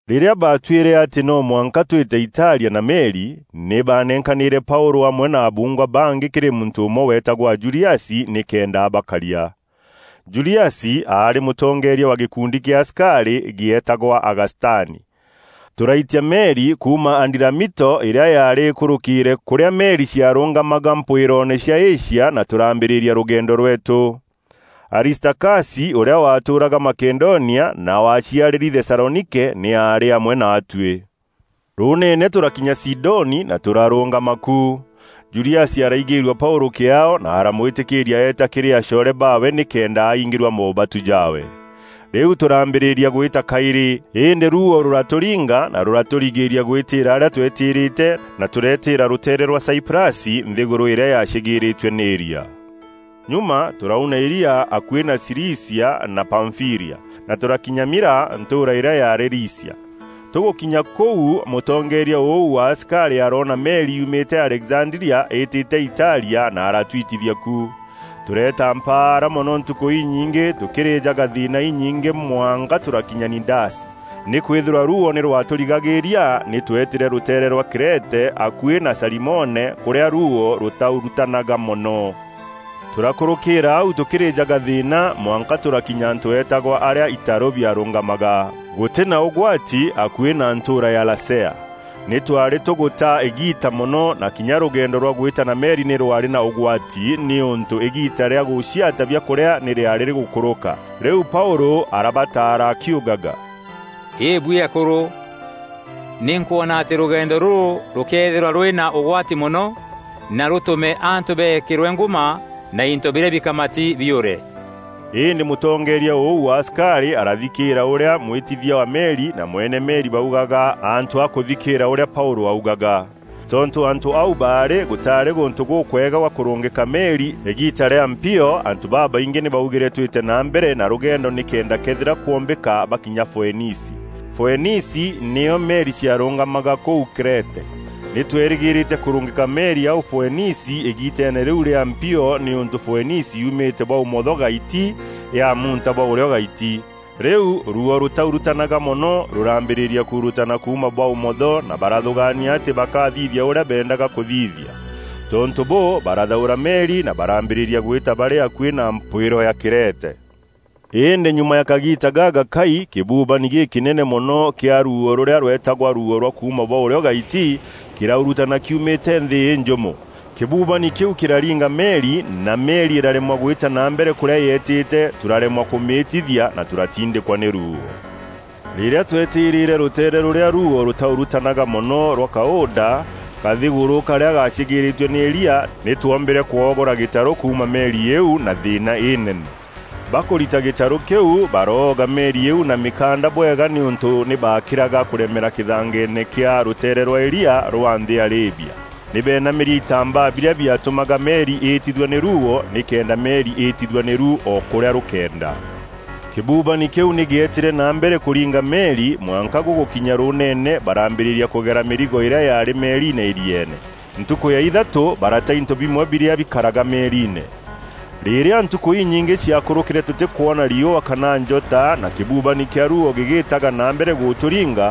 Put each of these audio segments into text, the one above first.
Rîrîa baatuîre atî no mwanka twîte Italia na meri, nî baanenkanîre Paûlû amwe na abuungwa bangî kîrî muntû ûmwe weetagwa Juliasi nîkenda abakaria. Juliasi aarî mûtongeeria wa gîkundi kîa asikarî, gîeetagwa Agastani. Tûraitia meri kuuma Adiramito îrîa yaarî îkûrûkîîre kûrîa meri ciarûngamaga mpwîroone cia Asia na tûraambîrîria rûgeendo rweetû. Aristakasi, ûrîa waatûûraga Makedonia, na waaciarîri Thesalonike, nî aarî amwe naatuî. Rûûneene tûrakinya Sidoni na tûrarûngama ku. Juliasi araigîîrua Paûlû kîaao na aramwîtîkîîria eeta kîrî acoore baawe nîkenda aingîrua moobatu jaawe. Rîu tûrambîrîria gwîta kaîrî, îndî ruuo rûratûringa na rûratûrigîîria gwîtîîra arîa tweetîrîte na tûreetîra rûteere rwa Saiprasi, nthîgûrû îrîa yaacîgîîrîîtue nî îria. Nyuma tûrauna îria akuî na Cilicia na Pamfîlia, na tûrakinya Mîra, ntûûra îrîa yaarî Lîcia. Tûgûkinya kûu, mûtongeeria ûu wa asikarî aroona meri yuumîte Alexandria îîtîte Italia, na aratuitithia ku. Tûreeta mpaara mono ntukû inyingî tûkîrîjaga thîîna înyingî mwanka tûrakinya Nidasi. Nîkwîthîrwa ruuo nî rwatûrigaîria, nî twetîrîre rûteere rwa Krete akuî na Salimone kûrîa ruuo rûtaurutanaga mono. Tûrakûrûkîîra au tûkîrîjaga thîîna mwanka tûrakinya antû eetagwa Arîa itaru biarungamaga, gûtîna ûgwati akuî na ntûûra ya Lasea. Nî twaarî tûgûta îgiita mono, na kinya rûgendo rwa gwîta na meri nî rwaarî na ûgwati nîûntû îgiita rîa gûciata biakûrîa nî rîaarî rîgûkûrûka. Rîu Paûlû arabataara akiugaga, “Îbuî akûrû, nî nkwona atî rûgendo rûrû rûkeethîrwa rûrî na ûgwati mono, na rûtûme antû beekîrwe ngûma na into birîa bikamati biûre.” Îndî mûtongeeria ûu wa asikarî arathikîîra ûrîa mwîtithia wa meri na mwene meri baugaga antû a kûthikîîra ûrîa Paûlû augaga. Tontû antû au baarî gûtaarî gûntû gûkwega gwa kûrûngîka meri îgiita rîa mpio, antû babaingî nî baugîre twîte na mbere na rûgendo, nîkenda këethîra kwombîka bakinya Foenici. Foenici nîo meri ciarûngamaga kûu Krete. Nî twerîgîrîte kûrûngîka meri au Foenici îgiiteene rîu rîa mpio nîûntû Foenici yuumîte bwa ûmotho-gaiti yaamunta bwa ûrîo-gaiti. Rîu ruuo rûtaurutanaga mono, rûrambîrîria kuurutana kuuma bwa ûmotho na barathûgaania atî bakathithia ûrîa beendaga kûthithia. Tontû bûû, barathaûra meri na barambîrîria gwîta barî akuî na mpwîro ya Krete. Îndî nyuma ya kagiita gagakai, kîbubani gîkînene mono kîa ruuo rûrîa rweetagwa Ruuo rwa kuuma bwa ûrîo-gaiti, kîraurûtana kiumîte nthî înjûmo. Kîbubani kîu kîraringa meri, na meri îraremwa gwîta na mbere kûrîa yeetîte, tûraremwa kûmîîtithia, na tûratindîkwa nî ruuo. Rîrîa twetîrîre rûteere rûrîa ruuo rûtaurutanaga mono rwa Kauda, kathîgûrû karîa gaacîgîîrîîtue nî îria, nî twombîre kwogora gîtarû kuuma meri îîu na thîîna înene. Bakûrita gîtarû kîu, baroga meri îîu na mîkanda bwega nîûntû nî baakîraga kûremera kîthangeene kîa rûteere rwa îrîa rwa nthî ya Lîbia. Nî beenamîrie itambaa birîa biatûmaga meri îîtithua nî ruuo, nîkenda meri îîtithua nîru o kûrîa rûkeenda. Kîbubani kîu nî gîetîre na mbere kûringa meri mwanka gûgûkinya rûûnene barambîrîria kûgera mîrigo îrîa yaarî meeriine îrieene. Ntukû ya ithatû barata into bimwe birîa bikaraga meeriine. Rîrîa ntukû inyingî ciakûrûkîre tûtîkwona riûa kana njota na kîbubani kîa ruuo gîgîtaga na mbere gûtûringa,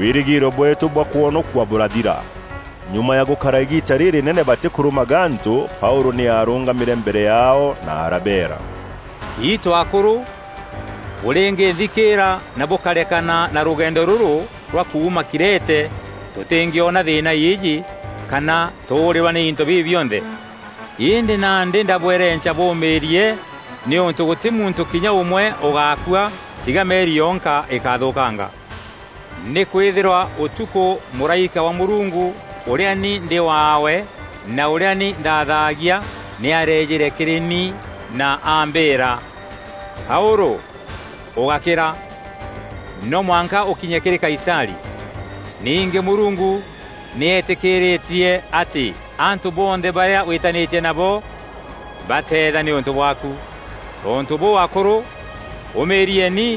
wîrîgîîro bweetû bwa kwonokua bûrathira. Nyuma ya gûkara îgiita rîrînene batîkûrûma gantû, Paûlû nî aarûngamîre mbere yaao na arabeera, “Itû akûrû, bûrîngînthikîîra na bûkarekana na rûgendo rûrû rwa kuuma Krete tûtîngîona thîîna îîjî kana tûûrîrwa nî into bibi bionthe. Îndî nandî ndabwerenca bûûmîîrie, nîûntû gûtî muntû kinya ûmwe ûgaakua tiga meri yonka îkathûkanga. Nîkwîthîrwa ûtukû mûraîka wa Mûrungu, ûrîa ni ndî waawe na ûrîa ni nthaathagia nî areejîre kîrî ni na aambîîra: ‘Paûlû, ûgákîra! No mwanka ûkinye kîrî Kaisarî. Ningî Mûrungu nî etîkîîrîtie atî antû bonthe barîa wîtanîtie nabo bateetha nîûntû bwaaku.’ Tontû bûû, akûrû! Ûmîîrieni,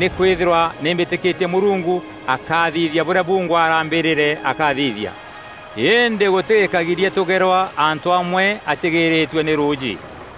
nîkwîthîrwa nî mbîtîkîtie Mûrungu akathithia bûrîa bungwa arambîrîre akathithia. Îndî gûtî gîkagiria tûgerwa antû amwe acîgîîrîîtue nî rûûjî.”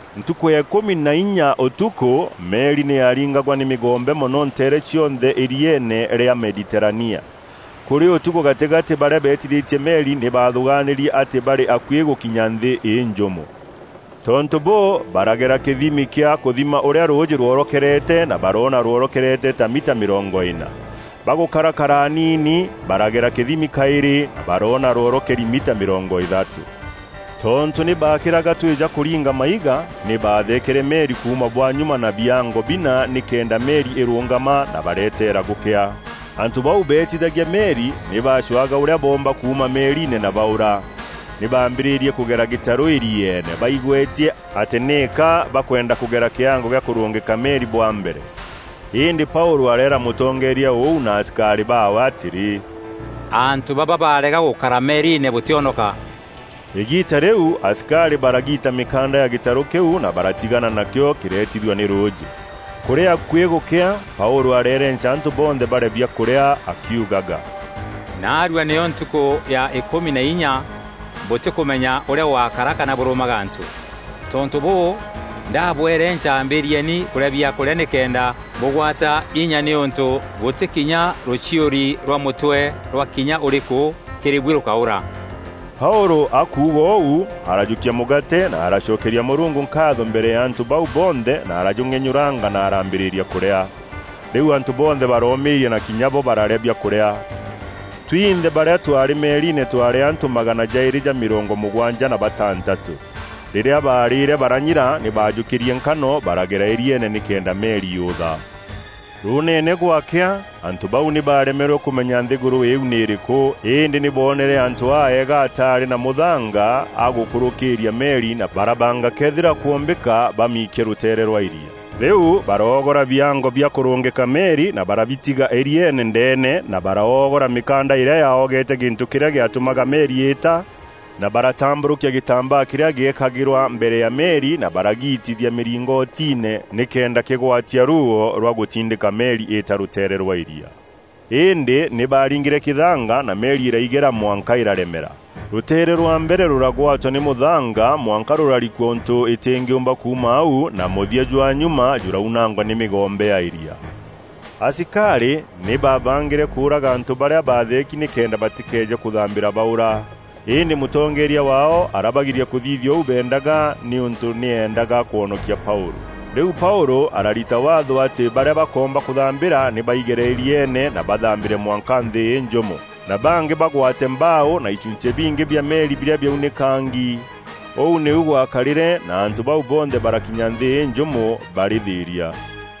Ntukû ya îkûmi na inya ûtukû, meri nî yaaringagwa nî mîgombe mono nteere cionthe îrieene rîa Mediterania. Kûrî ûtukû gatîgatî barîa beetithîtie meri nî baathûgaanîrie atî barî akuî gûkinya nthî înjûmo. Tontû bûû, baragera kîthimi kîa kûthima ûrîa rûûjî rworokerete na baroona rworokeri ta mita mîrongo îna. Bagûkarakara aniini, baragera kîthimi kaîrî na baroona rworokeri mita mîrongo îthatû. Tontû nî baakîraga twija kûringa maiga, nî baatheekere meri kuuma bwa nyuma na biango bina nîkenda meri îrûngama na bareeteera gûkea. Antû bau beetithagia meri nî baacwaga ûrîa boomba kuuma meeriine na baûra. Nî baambîrîrie kûgera gîtarû îrieene, baigwetie atî nîka bakwenda kûgera kîango gîa kûrûngîka meri bwa mbere. Îndî Paûlû areera mûtongeeria ûu na asikarî baawe atîrî, “Antû baba barega gûkara meeriine, bûtîonoka.” Îgiita rîu asikarî baragiita mîkanda ya gîtarû kîu na baratigana nakîo kîreetithua nî rûûjî. Kûrî akuî gûkea, Paûlû areerenca antû bonthe barîe biakûrîa akiugaga, “Naarua nîyo ntukû ya îkûmi na inya bûtîkûmenya ûrîa gûgakara kana bûrûma gantû. Tontû bûû, ndabwerenca ambîrîeni kûrîa biakûrîa nîkenda bûgwata inya nîûntû gûtî kinya rûchiûri rwa mûtwe rwa kinya ûrîkû kîrî buî rûkaûra.” Paûlû akuuga ûu, arajûkia mûgaate na aracokeria Mûrungu nkaatho mbere ya antû bau bonthe na arajûng'enyûranga na araambîrîria kûrîa. Rîu antû bonthe baroomîîria, na kinya bo bararîa biakûrîa. Twinthe barîa twaarî meeriine twaarî antû magana jaîrî ja mîrongo mûgwanja na batantatû. Rîrîa baarîre baranyira, nî baajûkîrie nkano baragera îrieene nîkenda meri yûtha. Rûûneene gwakea, antû bau nî baaremerwe kûmenya nthîgûrû îîu nî îrîkû, îndî nî booneere antû aeega ataarî na mûthanga a gûkûrûkîîria meri na barabanga këethîra kwombîka bamiikie rûteere rwa îria. Rîu baroogora biango bia kûrûngîka meri na barabitiga îrieene ndeene na baroogora mîkanda îrîa yaogete gîntû kîrîa gîatûmaga meri îîta; na baratambûrûkia gîtambaa kîrîa gîekagîrwa mbere ya meri na baragiitithia mîringotiine nîkenda kîgwatia ruuo rwa gûtindîka meri îîta rûteere rwa îria. Îndî nî baaringîre kîthanga na meri îraigera mwanka îraremera. Rûteere rwa mbere rûragwatwa nî mûthanga mwanka rûrarikua ûntû îtîngîûmba kuuma au na mûthia jwa nyuma jûraunangwa nî mîgombe ya îria. Asikarî nî baabangîre kûûraga antû barîa baatheeki nîkenda batîkeeje kûthambîra baûra. Îndî mûtongeeria waao arabagiria kûthithia ûu beendaga, nîûntû nî eendaga kwonokia Paûlû. Rîu Paûlû ararita waatho atî barîa bakoomba kûthambîra nî baigere îrieene, na bathambîre mwanka nthî înjûmo, na bangî bagwate mbaaû na ichunchî bingî bia meri birîa biaunîkangi. Ûu nîu gwakarîre, na antû bau bonthe barakinya nthî înjûmo barî thîîria.